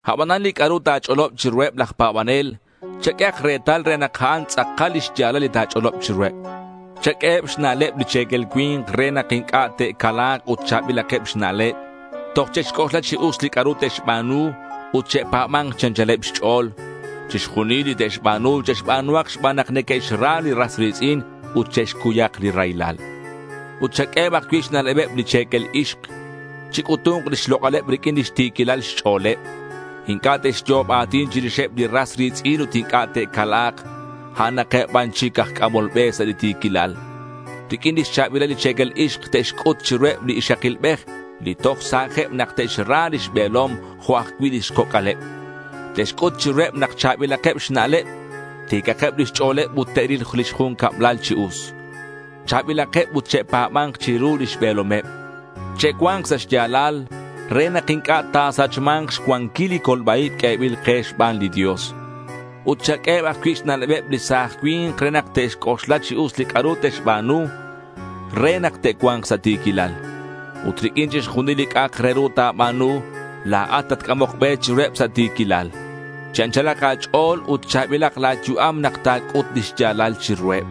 Abanan li c'a'ru ta̱ch'olob chiruheb laj pa̱banel, chaq'uehak retal re nak a'an tz'akal lix ya̱lal li ta̱ch'olob chiruheb. Chaq'ueheb xna'leb li che̱quel cui̱nk re nak inc'a' te'cala̱k ut cha̱bilakeb xna'leb. Toj che'xc'oxla chi us li c'a'ru te'xba̱nu ut che'pa̱ba̱nk chi anchaleb xch'o̱l. Chixjunil li te'xba̱nu, che'xba̱nuhak xban nak neque'xra li ras ri̱tz'in ut che'xcuyak li raylal. Ut chaq'ueheb ajcui' xna'lebeb li che̱quel ixk. Chic'utu̱nk lix lok'aleb riq'uin lix ti̱quilal xch'o̱leb. Inc'a' te'xyo'ob a̱tin chirixeb li ras ri̱tz'in ut inc'a' te'cala̱k. A'anakeb ban chic aj c'amol be sa' li ti̱quilal. Riq'uin lix cha̱bilal li che̱quel ixk te'xc'ut chiruheb li ixakilbej li toj sa̱jeb nak te'xra lix be̱lom jo' ajcui' lix coc'aleb. Te'xc'ut chiruheb nak cha̱bilakeb xna'leb, ti̱cakeb lix ch'o̱leb ut te'ril lix jun cablal chi us. Cha̱bilakeb ut che'pa̱ba̱nk chiru lix be̱lomeb. Che'cua̱nk sa' xya̱lal re nak inc'a' ta̱sachma̱nk xcuanquil li colba-ib q'uebil ke xban li Dios. Ut chaq'ueheb ajcui' xna'lebeb li sa̱j cui̱nk re nak te'xc'oxla chi us li c'a'ru te'xba̱nu re nak te'cua̱nk sa' ti̱quilal. Ut riq'uin chixjunil li c'a'ak re ru ta̱ba̱nu, la̱at tatc'amok be chiruheb sa' ti̱quilal. Chi anchalak a̱ch'o̱l ut cha̱bilak la̱ yu'am nak ta̱c'ut li xya̱lal chiruheb.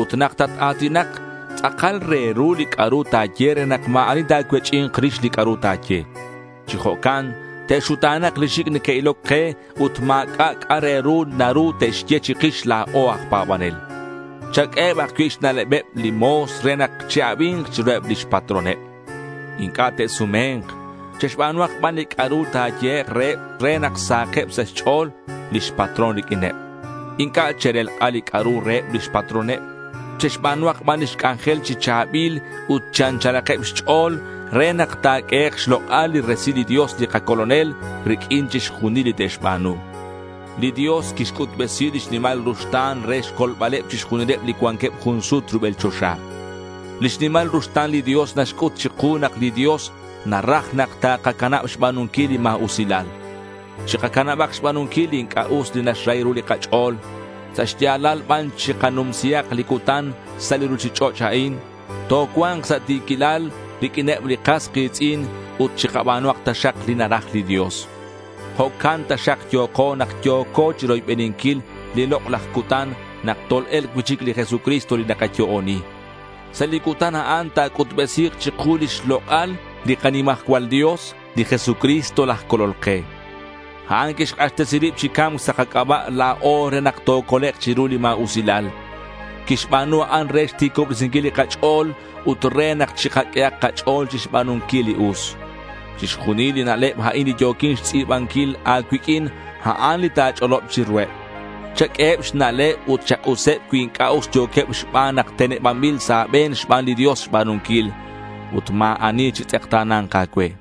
Ut nak tat-a̱tinak, tz'akal re ru li c'a'ru ta̱ye re nak ma̱ ani ta̱cuech'i̱nk rix li c'a'ru ta̱ye. Chi jo'can te'xuta̱na̱k li xic' neque'iloc ke ut ma̱c'a' c'a' re ru naru te'xye chikix la̱o aj pa̱banel. Chaq'ueheb ajcui' xna'lebeb li mo̱s re nak che'abi̱nk chiruheb lix patroneb. Inc'a' te'sume̱nk. Che'xba̱nuhak ban li c'a'ru ta̱yehek' reheb re nak sahakeb sa' xch'o̱l lix patrón riq'uineb. Inc'a' che'relk'a li c'a'ru reheb lix patroneb. Che'xba̱nuhak ban lix c'anjel chi cha̱bil ut chi anchalakeb xch'o̱l re nak ta̱q'uehek' xlok'al li resilal li Dios li kaColonel riq'uin chixjunil li te'xba̱nu. Li Dios quixc'utbesi lix nimal ruxta̱n re xcolbaleb chixjunileb li cuanqueb jun sut rubel choxa. Lix nimal ruxta̱n li Dios naxc'ut chiku nak li Dios naraj nak takacanab xba̱nunquil li ma̱usilal. Chikacanab xba̱nunquil li inc'a' us li naxrahi ru li kach'o̱l. Sa' xya̱lal ban chikanumsihak li cutan sa' li ruchich'och' a'in. Tocua̱nk sa' ti̱quilal riq'uineb li kas ki̱tz'in ut chikaba̱nuhak taxak li naraj li Dios. Jo'can taxak yo̱ko nak yo̱ko chiroybeninquil li lok'laj cutan nak tol-e̱lk cui'chic li Jesucristo li nakayo'oni. Sa' li cutan a'an ta̱c'utbesi̱k chiku lix lok'al li kanimajcual Dios, li Jesucristo laj Colol ke. A'an quixk'axtesi rib chi ca̱mc sa' kac'aba' la̱o re nak tocolek' chiru li ma̱usilal. Quixba̱nu a'an re xti̱cobresinquil li kach'o̱l ut re nak chikaq'uehak kach'o̱l chixba̱nunquil li us. Chixjunil li na'leb a'in li yo̱quin xtz'i̱ban-quil a̱cuiq'uin, a'an li ta̱ch'olob chiruheb. Chaq'ueheb xna'leb ut chak'useb cui inc'a' us yo̱queb xban nak tenebanbil sa' a̱be̱n xban li Dios xba̱nunquil. Ut ma̱ ani chitz'ekta̱na̱nk a̱cue.